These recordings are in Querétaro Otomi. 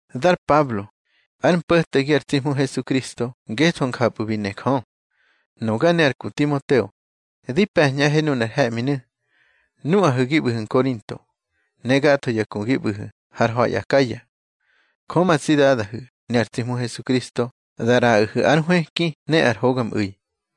Dar Pablo, ár mpo̱tegi ar tsi Hmu Hesukristo ngetho njapꞌu̱ bi ne Jö. Nuga ne ar ku Timoteo, di pe̱ñꞌahe nunar he̱ꞌminu̱, nuꞌahu̱ gi ꞌbu̱hu̱ Nkorinto, ne gatho ya ku gi ꞌbu̱hu̱ har ha̱i Akaya. Jö ma tsi Dadahu̱ ne ar tsi Hmu Hesukristo da ꞌraꞌahu̱ ár nhwëki ne ar hogamꞌu̱i.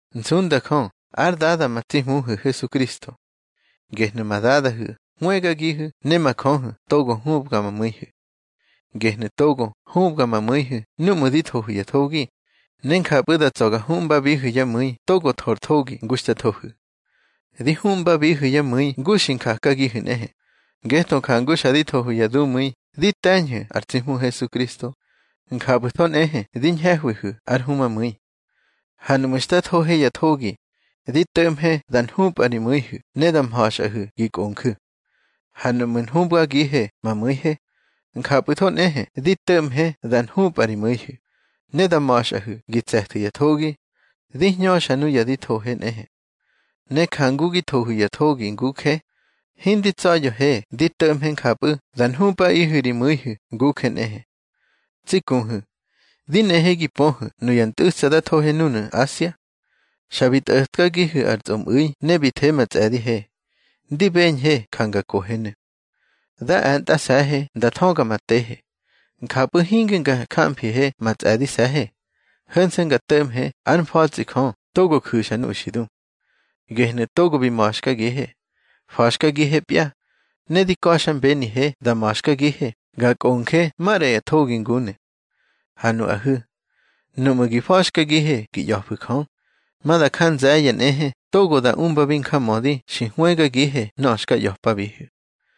Nsunda Jö ár Dada ma tsi Hmuhu̱ Hesukristo. Gehnu̱ ma Dadahu̱ hwëgagihu̱ ne ma Jöhu̱ togo hubga ma mu̱ihu̱. Gehnu̱ togo hubga ma mu̱ihu̱ núꞌmu̱ di thohu̱ ya thogi, ne njapꞌu̱ da tsa̱ ga huꞌmbabihu̱ yá mu̱i togo tho ar thogi ngu xta thohu̱. Di huꞌmbabihu̱ yá mu̱i ngu xi njakagihu̱ nꞌehe. Ngetho jangu xa di thohu̱ ya dumu̱i di te̱ñhu̱ ar tsi Hmu Hesukristo, njapꞌu̱tho nꞌehe di ñhehwihu̱ ár humamu̱i. Ha nuꞌmu̱ xta thohe ya thogi, di to̱ꞌmhe da nhupꞌa ri mu̱ihu̱ ne da ma̱xꞌahu̱ gi kꞌonju̱. Ha nuꞌmu̱ nhubgagihe ma mu̱ihe, njapꞌu̱tho nꞌehe di to̱ꞌmhe da nhupꞌa ri mu̱ihu̱, ne da ma̱xꞌahu̱ gi tse̱thu̱ ya thogi, di hñöxa nuya di thohe nꞌehe. Ne jangu gi thohu̱ ya thogi nguje, hindi tsa̱ya̱he di to̱ꞌmhe njapꞌu̱ da nhupꞌaꞌihu̱ ri mu̱ihu̱ nguje nꞌehe. Tsi kuhu̱, di nehe gi pöhu̱ nuya ntꞌu̱tsa da thohe núnu̱ Asia. Xa bi tꞌo̱tkagihe ar tsꞌomꞌu̱i ne bi the ma tsꞌe̱dihe, ndi beñhe ja nga kohenu̱. Da e̱ntꞌase̱he nda thöga ma tehe. Njapꞌu̱ hinge nga jamfihe ma tsꞌe̱dise̱he, ho̱nse̱ nga to̱ꞌmhe ár mfa̱tsꞌi Jö togo ju̱xa nuya xi du. Gehnu̱ togo bi ma̱xkagihe, fa̱xkagihepya, ne di ka̱xmbenihe da ma̱xkagihe ga kꞌonje maꞌra ya thogi ngunu̱. Ha nuꞌahu̱, nuꞌmu̱ gi fa̱xkagihe gi ꞌya̱fu̱ Jö, ma da nja nze̱ye̱ nꞌehe togo da umbabi njamödi xi hwëgagihe nöꞌö xka ꞌya̱pabihu̱.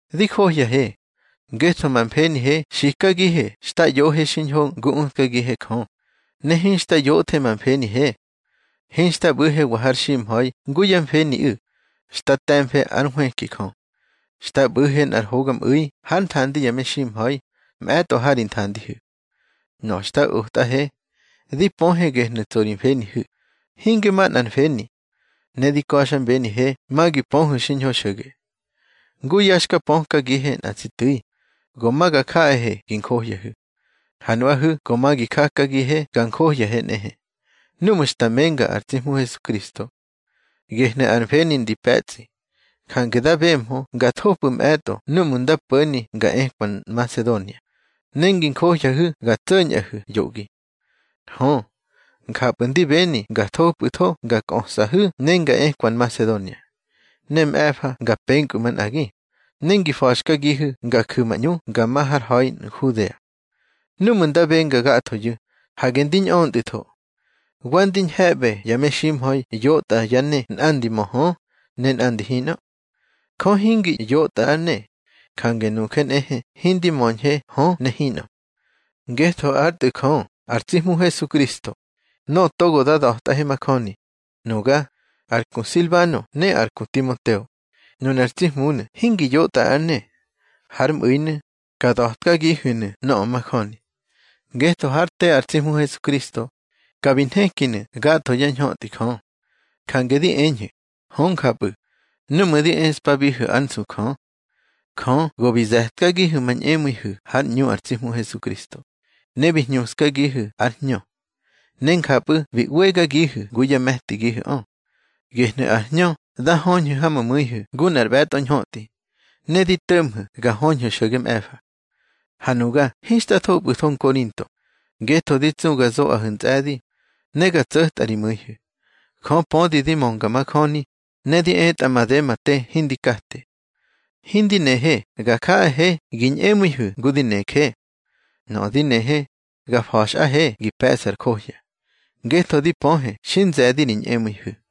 Di johyahe, ngetho ma mfenihe xikagihe xta ꞌyohe xiñho ngu utkagihe Jö, ne hinxta yoꞌthe ma mfenihe. Hinxta ꞌbu̱hewa har ximha̱i ngu yá mfeniꞌu̱, xta te̱mfe ár nhwëki Jö. Xta ꞌbu̱he nꞌar hogamꞌu̱i hár nthandi ya meximha̱i, mꞌe̱tꞌo ha ri nthandihu̱. Nöꞌö xta otꞌahe, di pöhe gehnu̱ tso ri mfenihu̱, hinge manꞌar mfeni. Ne di ka̱xmbenihe ma gi pöhu̱ xiñho xo̱ge. Ngu ya xka pökagihe nꞌa tsi tu̱i, go ma ga jaꞌahe gi njohyahu̱. Ha nuꞌahu̱ go ma gi jakagihe ga njohyahe nꞌehe, núꞌmu̱ xta menga ar tsi Hmu Hesukristo. Gehnu̱ ar mfeni ndi pe̱tsꞌi. Jange da bemhö nga thopꞌu̱ mꞌe̱tꞌo núꞌmu̱ nda po̱ni nga ekwa Nmasedonia, ne ngi njohyahu̱ ga tso̱ñꞌahu̱ yoꞌgi. Hö, njapꞌu̱ ndi beni nga thopꞌu̱tho nga kꞌösꞌahu̱ ne nga ekwa Nmasedonia. Ne mꞌe̱fa nga penkpꞌu̱ manꞌagi, ne ngi fa̱xkagihu̱ nga ju̱ ma ꞌñu nga ma har ha̱i Nhudea. Núꞌmu̱ nda benga gathoyu̱, hage ndi ñꞌöntꞌu̱tho. Wa ndi ñhe̱ꞌbe ya meximha̱i yotꞌa yá ne nꞌandi mö hö, ne nꞌandi hinꞌö. Jö hingi yotꞌa ár ne, jange nuje nꞌehe hindi möñhe hö ne hinꞌö. Ngetho ár Tꞌu̱ Jö ar tsi Hmu Hesukristo, nöꞌö togo da da̱tꞌahe majöni, nuga, ar ku Silbano ne ar ku Timoteo, nunar tsi Hmunu̱ hingi yotꞌa ár ne. Hár mꞌu̱inu̱, ka da̱tkagihu̱nu̱ nöꞌö majöni. Ngetho hár te ar tsi Hmu Hesukristo, ka bi nhekinu̱ gatho yá ñhötꞌi Jö. Jange di eñhu̱, hö njapꞌu̱, núꞌmu̱ di eꞌspabihu̱ ár nsu Jö. Jö go bi ze̱tkagihu̱ ma ñꞌemu̱ihu̱ hár ꞌñu ar tsi Hmu Hesukristo, ne bi hñuskagihu̱ ár Hñö. Ne njapꞌu̱ bi ꞌwegagihu̱ ngu yá me̱tigihu̱ꞌö. Gehnu̱ ar Hñö da höñhu̱ ha ma mu̱ihu̱ ngu nꞌar ꞌbe̱tꞌo ñhötꞌi, ne di to̱ꞌmhu̱ ga höñhu̱ xo̱ge mꞌe̱fa. Ha nuga hinxta thopꞌu̱tho Nkorinto, ngetho di tsu ga zoꞌahu̱ ntsꞌe̱di, ne ga tso̱tꞌa ri mu̱ihu̱. Jö pödi di mönga majöni, ne di etꞌa made ma te hindi kate. Hindi nehe ga jaꞌahe gi ñꞌemu̱ihu̱ ngu di neje. Nöꞌö di nehe, ga fa̱xꞌahe gi pe̱ꞌsu̱ ar johya, ngetho di pöhe xi nze̱di ri ñꞌemu̱ihu̱.